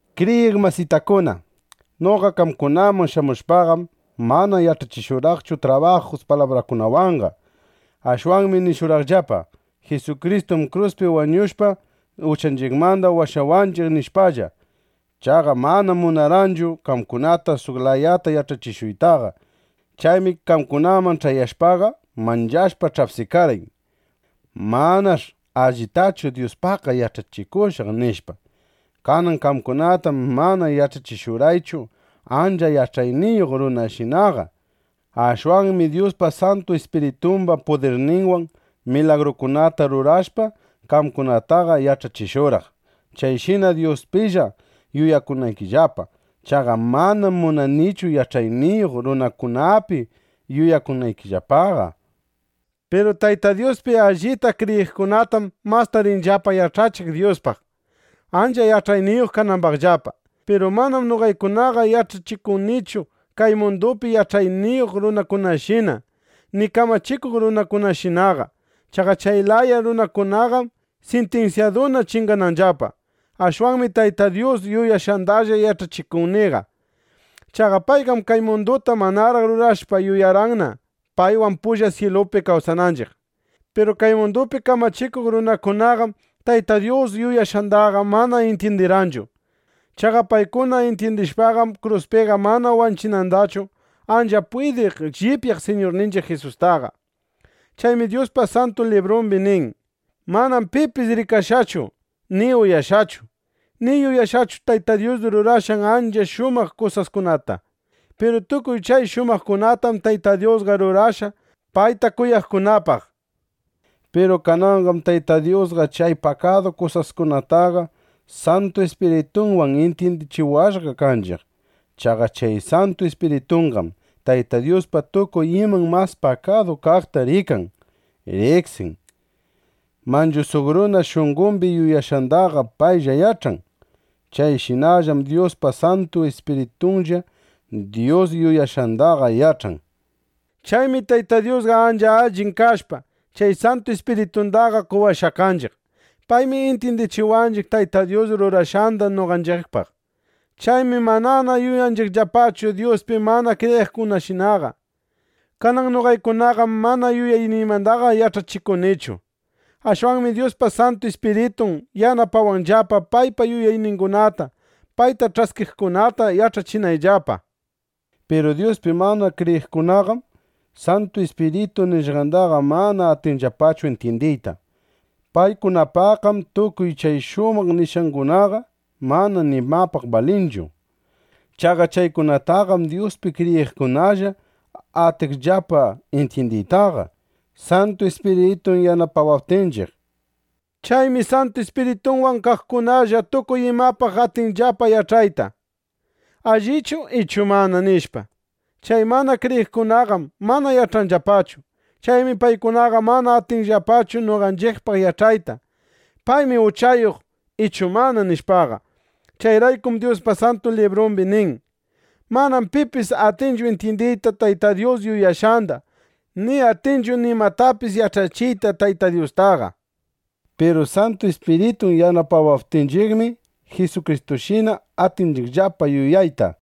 Kriyiq masitakuna, noqa qamkunaman shamushpaqam, mana yach'achishurqaqchu trabajus palabrakunawanqa. Ashwanmi nishurqaqllapa: “Jisukristum kruspi wañushqa, uchanchiqmanda washawananchiq”, nishpalla. Chaqa manam munarqaychu qamkunata suq layata yach'achishuytaqa. Chaymi qamkunaman ch'ayashpaqa, manchashpa ch'apsikarqay: Manash' allitachu Dyuspaqqa yach'achikushaq, nishpa. Kanan qamkunatam mana yach'achishurqaychu ancha yach'ayniyuq runashinaqa. Ashwanmi Dyuspa Santu Ispiritumba pudirninwan milagrukunata rurashpa, qamkunataqa yach'achishurqaq, chayshina Dyuspilla yuyakunaykillapa. Chaqa manam munanichu, yach'ayniyuq runakunapi yuyakunaykillapaqa. Piru Tayta Dyuspi allita kriyiqkunatam masta rinillapa yach'achiq Dyuspaq, ancha yach'ayniyuq kanambaqllapa. Piru manam noqaykunaqa yach'achikunichu kay mundupi yach'ayniyuq runakunashina, ni kamachikuq runakunashinaqa. Chaqa chay laya runakunaqam sintinsyaduna chingananllapa. Ashwanmi Tayta Dyus yuyashqandalla yach'achikuniqa. Chaqa payqam kay munduta manaraq rurashpa yuyarqanna, paywan pulla syilupi kawsananchiq. Piru kay mundupi kamachikuq runakunaqam Tayta Dyus yuyashqandaqa mana intyindirqanchu. Chaqa paykuna intyindishpaqam, kruspiqa mana wanchinandachu ancha pwidiq llipyaq Siñurninchiq Jisustaqa. Chaymi Dyuspa Santu Librumbi nin: Manam pipis rikashqachu, ni uyashqachu, ni yuyashqachu Tayta Dyus rurashqan ancha shumaq kusaskunata. Piru tukuy chay shumaqkunatam Tayta Dyusqa rurashqa payta kuyaqkunapaq, nishpa. Piru kananqam Tayta Dyusqa chay pakadu kusaskunataqa Santu Ispiritunwan intyindichiwashqa kanchiq. Chaqa chay Santu Ispiritunqam, Tayta Dyuspa tukuy iman mas pakadu kaqta rikan, riqsin. Manchu suq runa shunqombi yuyashqandaqa paylla yach'an. Chayshinallam Dyuspa Santu Ispiritunlla Dyus yuyashqandaqa yach'an. Chaymi Tayta Dyusqa ancha allin kashpa, chay Santu Ispiritundaqa qowashqa kanchiq. Paymi intyindichiwanchiq Tayta Dyus rurashqanda noqanchiqpaq. Chaymi manana yuyanchiqllapachu Dyuspi mana kriyiqkunashinaqa. Kanan noqaykunaqam mana yuyayniymandaqa yach'achikunichu. Ashwanmi Dyuspa Santu Ispiritun yanapawanllapa, paypa yuyayningunata payta ch'askiqkunata yach'achinayllapa Piru Dyuspi mana kriyiqkunaqam Santu Ispiritu nishqandaqa mana atinllapachu intyindiyta. Paykunapaqqam tukuy chay shumaq nishqangunaqa mana nimapaq balinchu. Chaqa chaykunataqam Dyuspi kriyiqkunalla atinchiqllapa intyindiytaqa, Santu Ispiritun yanapawaptinchiq. Chaymi Santu Ispirituwan kaqkunalla tukuy imapaq atinchiqllapa yach'ayta: ¿Allichu ichu mana? nishpa. Chay mana kriyiqkunaqam mana yach'anllapachu. Chaymi paykunaqa mana atinllapachu noqanchiqpaq yach'ayta: “Paymi uchayuq ichu mana”, nishpaqa. Chayraykum Dyuspa Santu Librumbi nin: “Manam pipis atinchu intyindiyta Tayta Dyus yuyashqanda, ni atinchu nimatapis yach'achiyta Tayta Dyustaqa”, nishpa. Piru Santu Ispiritun yanapawaptinchiqmi, Jisukristushina atinchiqllapa yuyayta.